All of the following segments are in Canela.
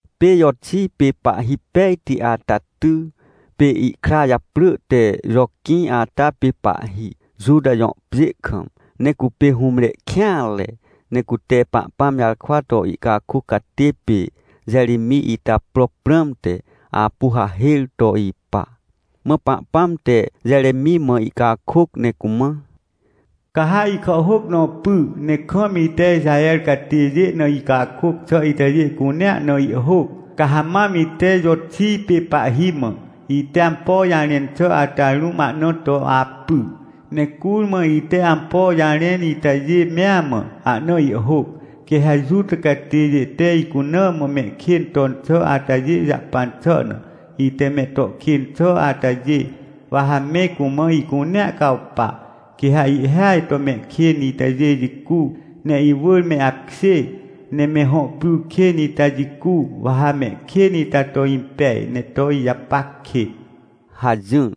Pê Joxij pê pahhi pejti ata ty, pê ihkra japrỳ te Joquĩ ata pê pahhi, Juta jõ pjê kam. Ne cupê hũmre kêanre, ne cute Pahpãm jarkwa to ihcakôc catê pê Jeremij ita pro prãmte, apu hahêr to ipa. Mã Pahpãm te Jeremij mã ihcakôc ne cumã: — Ca ha ihkàhhôc nõ py, ne kam ite Ixaher catêjê na icakôc xà itajê cunea na ihhôc. Ca ha mam ite Joxij pê pahhi mã, ite ampo jarẽn xà ata rũm ahna to apy, ne curmã ite ampo jarẽn itajê mea mã, ahna ihhôc. Quê ha Juta catêjê te icuna mã mehkên ton xà atajê jahpan xà na, ite me to kên xà atajê, wa ha me cumã ihcunea cawpa. Quê ha ihhêaj to mehkên itajê jicu, ne iwỳr me apkjê, ne me hõ pry kên ita jicu, wa ha mehkên ita to impej, ne to ijapac kêt — hajỹr.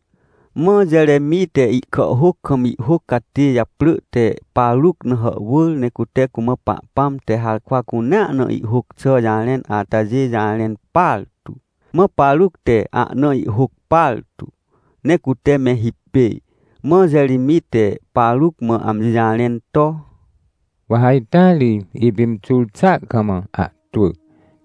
Mã Jeremij te ihkàhhôc kam ihhôc catê japrỳ te Paruc na hàhwỳr. Ne cute cumã Pahpãm te harkwa cunea na ihhôc xà jarẽn atajê jarẽn partu. Mã Paruc te ahna ihhôc partu, ne cute me hipêj. Mã Jeremij te Paruc mã amji jarẽn to: — Wa ha ita ri, ipimxur xà kam ahtwỳ.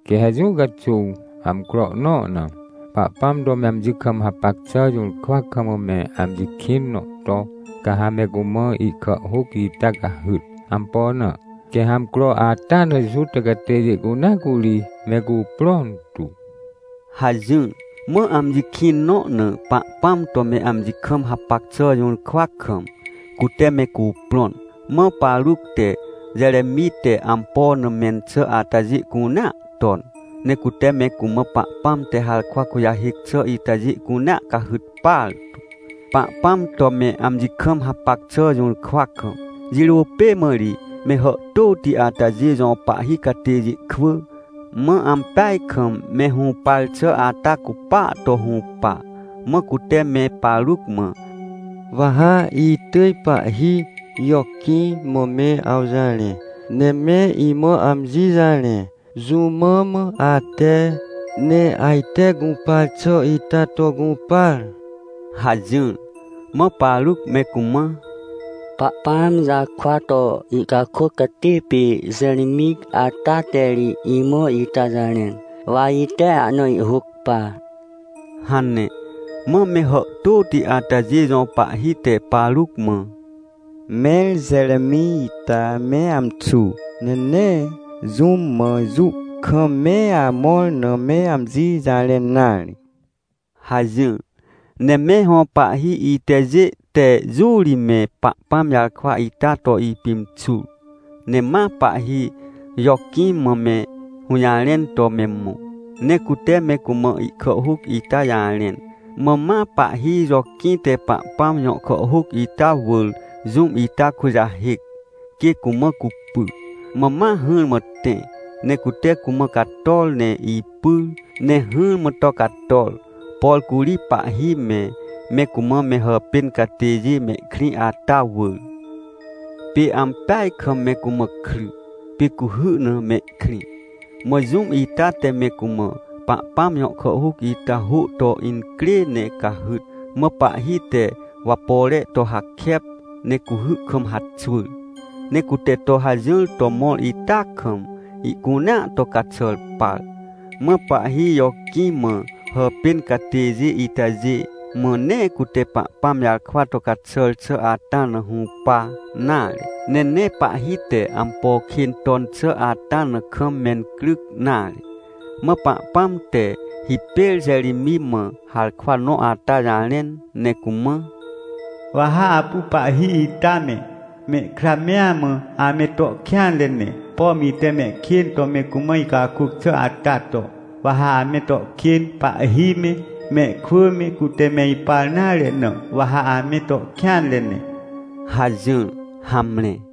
Quê ha jũ caxuw, amcro nõ na, Pahpãm to me amji kam hapac xà jũrkwa kam me amji kĩn nõ to, ca ha me cumã ihkàhhôc ita cahyt. Ampo na? Quê ha amcro ata na Juta catêjê cunea curi me cuprõn tu — hajỹr. Mã amji kĩn nõ na Pahpãm to me amji kam hapac xà jũrkwa kam, cute me cuprõn. Mã Paruc te Jeremij te ampo na mẽn xà atajê cunea ton. Ne cute me cumã Pahpãm te harkwa kujahêc xà itajê cunea cahyt partu, Pahpãm to me amji kam hapac xà jũrkwa kam. Jirô pê mã ri me hàhtôti atajê jõ pahhi catêjê kwỳ, mã ampeaj kam me hũpar xà ata cupaa to hũpa. Mã cute me Paruc mã: — Wa ha itỳj pahhi Joquĩ mã me awjarẽ. Ne me imã amji jarẽ, jũ mã mã ate, ne ajte gũpar xà ita to gũpar? — hajỹr. Mã Paruc me cumã: — Pahpãm jarkwa to ihcakôc catê pê Jeremij ata te ri imã ita jarẽn, wa ite ahna ihhôc par — hane. Mã me hàhtôti atajê jõ pahhi te Paruc mã: — Mẽr Jeremij ita me amxu, ne nee jũm mã jũ kam me amõr na me amji jarẽn nare — hajỹr. Ne me hõ pahhi itajê te jũ ri me Pahpãm jarkwa ita to ipimxur, ne ma pahhi Joquĩ mã me hũjarẽn to me mõ, ne cute me cumã ihkàhhôc ita jarẽn. Mã ma pahhi Joquĩ te Pahpãm jõ kàhhôc ita wỳr jũm ita kujahêc, quê cumã cupy. Mã ma hỹrmã tẽ, ne cute cumã cator ne ipyr ne hỹrmã to cator, por curi pahhi me, me cumã me hàpên catêjê mehkrĩ ata wỳr. Pê ampeaj kam me cumã kry, pê cuhy na mehkrĩ. Mã jũm ita te me cumã Pahpãm jõ kàhhôc ita hô to incrê ne cahyt. Mã pahhi te wapore to hakep, ne cuhy kam haxwỳr. Ne cute to hajỹr to mõr ita kam, ihcunea to caxàr par. Mã pahhi Joquĩ mã hàpên catêjê itajê mã nee cute Pahpãm jarkwa to caxàr xà ata na hũpa nare, ne nee pahhi te ampo kên ton xà ata na kam mencryc nare. Mã Pahpãm te hipêr Jeremij mã harkwa nõ ata jarẽn ne cumã: — Wa ha apu pahhi ita me, mehkra mea mã, ame to kêanre ne, pom ite mehkên to me cumã icakôc xà ata to, wa ha ame to kên, pahhi me, mehkwỳ me, cute me ipar nare na, wa ha ame to kêanre ne — hajỹr. Hamre.